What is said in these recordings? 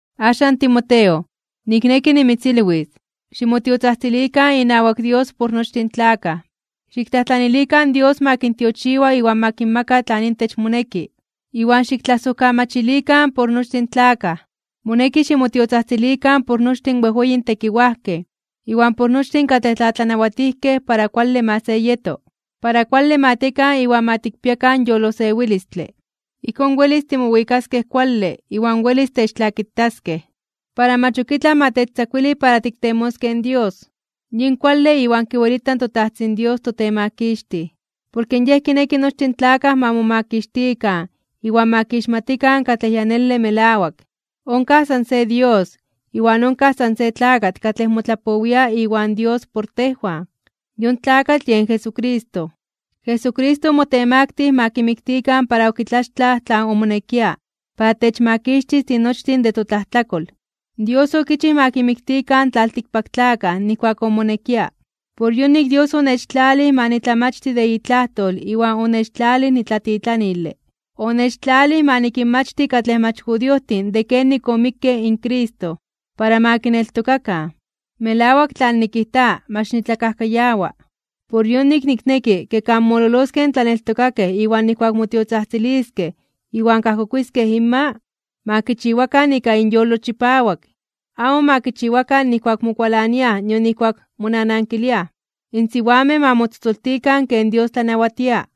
Axan Timoteo, nikneki nimitzilwis, ximotiotzajtzilikan inawak Dios por nochtin in tlakaj. Xiktlajtlanilikan in Dios ma kintiochiwa iwan ma kinmaka tlan intech moneki, iwan xiktlasojkamachilikan por nochtin tlakaj. Moneki ximotiotzajtzilikan por nochtin in wejweyin tekiwajkej iwan por nochtin katlej tlatlanawatijkej para kuale ma se yeto. Para kuale ma tiekan iwan ma tikpiakan yolosewilistle. Ijkón, welis timowikaskej kuale iwan welis techtlakitaskej, para mach ok itlaj ma techtzakuili para tiktemoskej in Dios. Yin kuale iwan kiwelita in toTajtzin Dios toTemakixtij. Porke Yej kineki nochtin in tlakaj ma momakixtikan iwan ma kixmatikan katlej ya nele melawak. Onkaj san se Dios, iwan onkaj san se tlakatl katlej motlapowia iwan Dios por tejwan. Yon tlakatl yen Jesucristo. Jesucristo omotemaktij (omotemaktilij) ma kimiktikan para okitlaxtlaj tlan omonekia para techmakixtis tinochtin de totlajtlatlakol. Dios okichij ma kimatikan in tlaltikpaktlakaj nijkuak omonekia. Por yonik Dios onechtlalij ma nitlamachti de itlajtol iwan onechtlalij nitlatitlanile. Onechtlalij ma nikinmachti katlej mach judiojtin de kenik omikke in Cristo, para ma kineltokakan. Melawak tlan nikijta, mach nitlakajkayawa. Por yonik, nikneki, ke kan mololoskej in tlaneltokakej iwan nijkuak motiotzajtziliskej iwan kajkokuiskej inma, ma kichiwakan ika inyolo chipawak, amo ma kichiwakan nijkuak mokualaniaj nion nijkuak monanankiliaj. In siwamej ma motzotzoltikan ken Dios tlanawatia,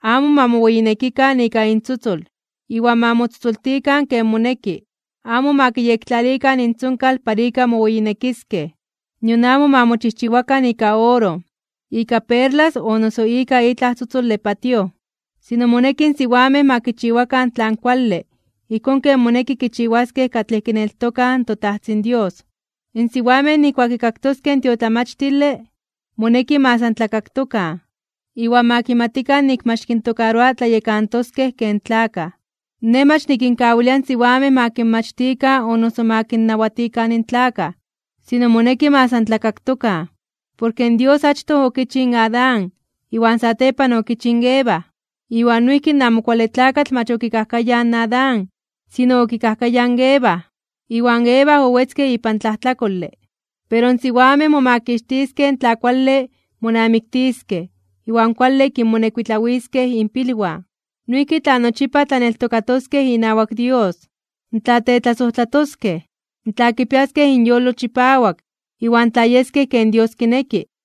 amo ma moweyinekikan ika intzotzol, iwan ma motzotzoltikan ken moneki. Amo ma kiyektlalikan intzonkal para ika moweyinekiskej, nion amo ma mochijchiwakan ika oro, ika perlas o noso ika itlaj tzotzole patíoj. Sino moneki in siwamej ma kichiwakan tlan kuale ijkón ken moneki kichiwaskej katlej kineltokaj in toTajtzin Dios. In siwamej nijkuak kikaktoskej in tiotlamachtile, moneki ma san tlakaktokan, iwan ma kimatikan nik mach kintokaroa tlayekantoskej ken tlakaj. Nej mach nikinkawilia in siwamej ma kinmachtikan o noso ma kinnawatikan in tlakaj, sino moneki ma san tlakaktokan. Porke Dios achtoj okichij in Adán iwan satepan okichij in Eva. Iwan noijki in Amo Kuale Tlakatl mach okikajkayaj in Adán, sino okikajkayaj in Eva, iwan Eva owetzke ipan tlajtlakole. Pero in siwamej momakixtiskej tla kuale monamiktiskej iwan kuale kinmonekuitlawiskej inpilwan. Noijki tla nochipa tlaneltokatoskej inawak Dios, tla tetlasojtlatoskej, tla kipiaskej inyolo chipawak, iwan tla yeskej ken Dios kineki.